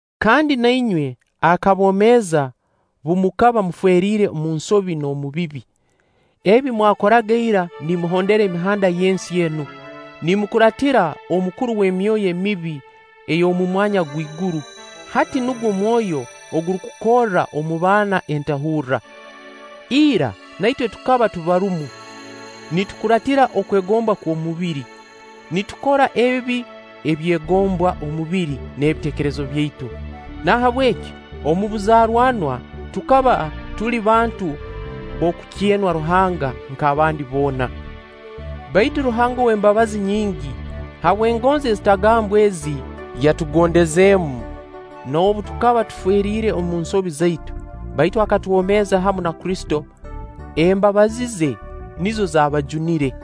Kandi na inywe akabomeeza bu mukaba mufeeriire omu nsobi n'omu bibi, ebi mwakoraga ira nimuhondera emihanda y'ensi enu, nimukuraatira omukuru ow'emyoyo emibi ey'omu mwanya gw'iguru, hati nugwo mwoyo ogurukukorra omu baana entahurra. Ira na itwe tukaba tubarumu nitukuraatira okwegomba okw'omubiri, nitukora ebi ebyegombwa omubiri n'ebiteekerezo byaitu. Nahabweki omu buzaaranwa tukaba tuli bantu b'okukyenwa Ruhanga nk'abandi boona. Baitu Ruhanga ow'embabazi nyingi, habw'engonzi ezitagambwa ezi yatugondezeemu, noobu tukaba tuferiire omu nsobi zaitu, baitu akatwomeeza hamu na Kristo, (embabazi ze nizo zaabajunire).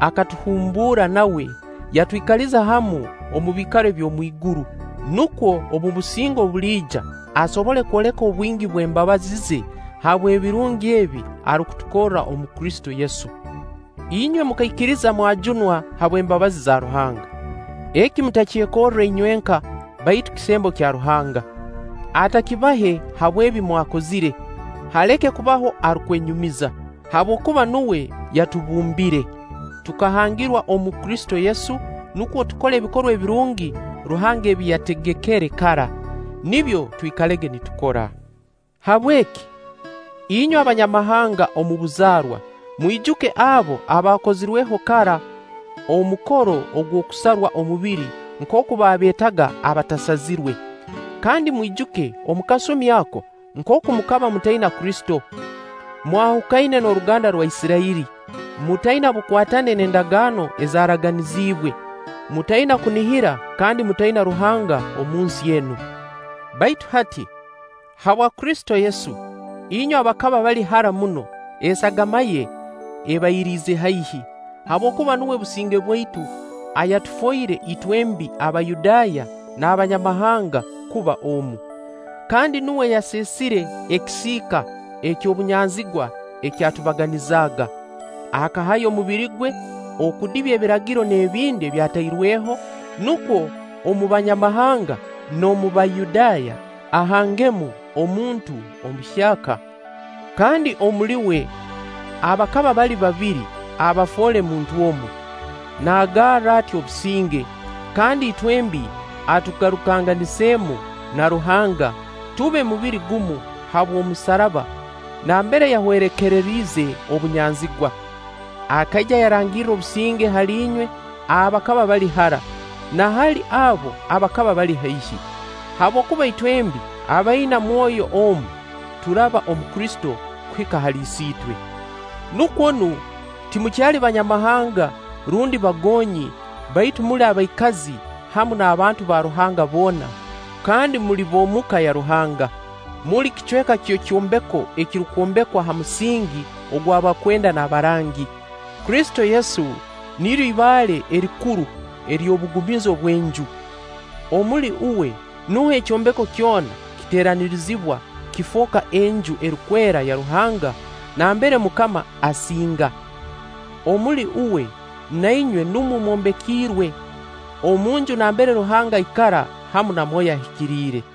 Akatuhumbuura nawe, yatwikaliza hamu omu biikaro eby'omu iguru, nukwo omu businge obuliija asobole kwoleka obwingi bw'embabazi ze habw'ebirungi ebi arukutukorra omu Kristo Yesu. Inywe mukaikiriza mwajunwa habw'embabazi za Ruhanga. Eki mutakyekorre inywenka, baitu kisembo kya Ruhanga. Atakibahe habw'ebi mwakozire, haleke kubaho arukwenyumiza. Habwokuba nuwe yatubumbire. Tukahangirwa omu Kristo Yesu nukwo tukole ebikorwa ebirungi Ruhanga ebi yategekere kara. Nibyo twikalege nitukora. Habweki, inywe Abanyamahanga omu buzaarwa, mwijuke abo abaakozirweho kara omukoro ogw'okusarwa omubiri nkooku baabeetaga abatasazirwe. Kandi mwijuke omu kasumi ako nkooku mukaba mutaina Kristo, mwahukaine n'oruganda rwa Isirairi, mutaina bukwatane n'endagaano ezaaraganizibwe, mutaina kunihira kandi mutaina Ruhanga omu nsi enu. Baitu hati, habwa Kristo Yesu, inywe abakaba bali hara muno, esagama ye ebairiize haihi, habwokuba nuwe businge bwaitu, ayatufoire itwembi Abayudaaya n'Abanyamahanga kuba omu. Kandi nuwe yaseesire ekisiika eky'obunyanzigwa ekyatubaganizaaga. Akahayo omubiri gwe okudibya Ebiragiro n'ebindi ebyatairweho, nukwo omu Banyamahanga n'omu Bayudaaya ahangemu omuntu omuhyaka, kandi omuli uwe abakaba bali babiri abafoole muntu omu, naagarra ati obusinge, Kandi itwembi atugarukanganizemu na Ruhanga, tube mubiri gumu habw'omusaraba nambere yahwerekeriize obunyanzigwa. Akaija yarangirra obusinge hali inywe abakaba bali hara, na hali abo abakaba bali haihi; habwokuba itwembi abaina Mwoyo omu, turaba omu Kristo kuhika hali Isiitwe. Nukwo nu, timukyali banyamahanga rundi bagonyi, baitu muli abaikazi hamu n'abantu ba Ruhanga boona, kandi muli b'omuka ya Ruhanga. Muli kicweka ky'ekyombeko ekirukwombekwa ha musingi gw'abakwenda n'abarangi. Kristo Yesu niryo ibaale erikuru ery'obugumizo bw'enju. Omuli uwe nuho ekyombeko kyona kiteeranirizibwa kifooka Enju erukwera ya Ruhanga, nambere MUKAMA asinga. Omuli uwe, na inywe numwo mwombekiirwe omunju nambere Ruhanga aikara hamu na Mwoyo Ahikiriire.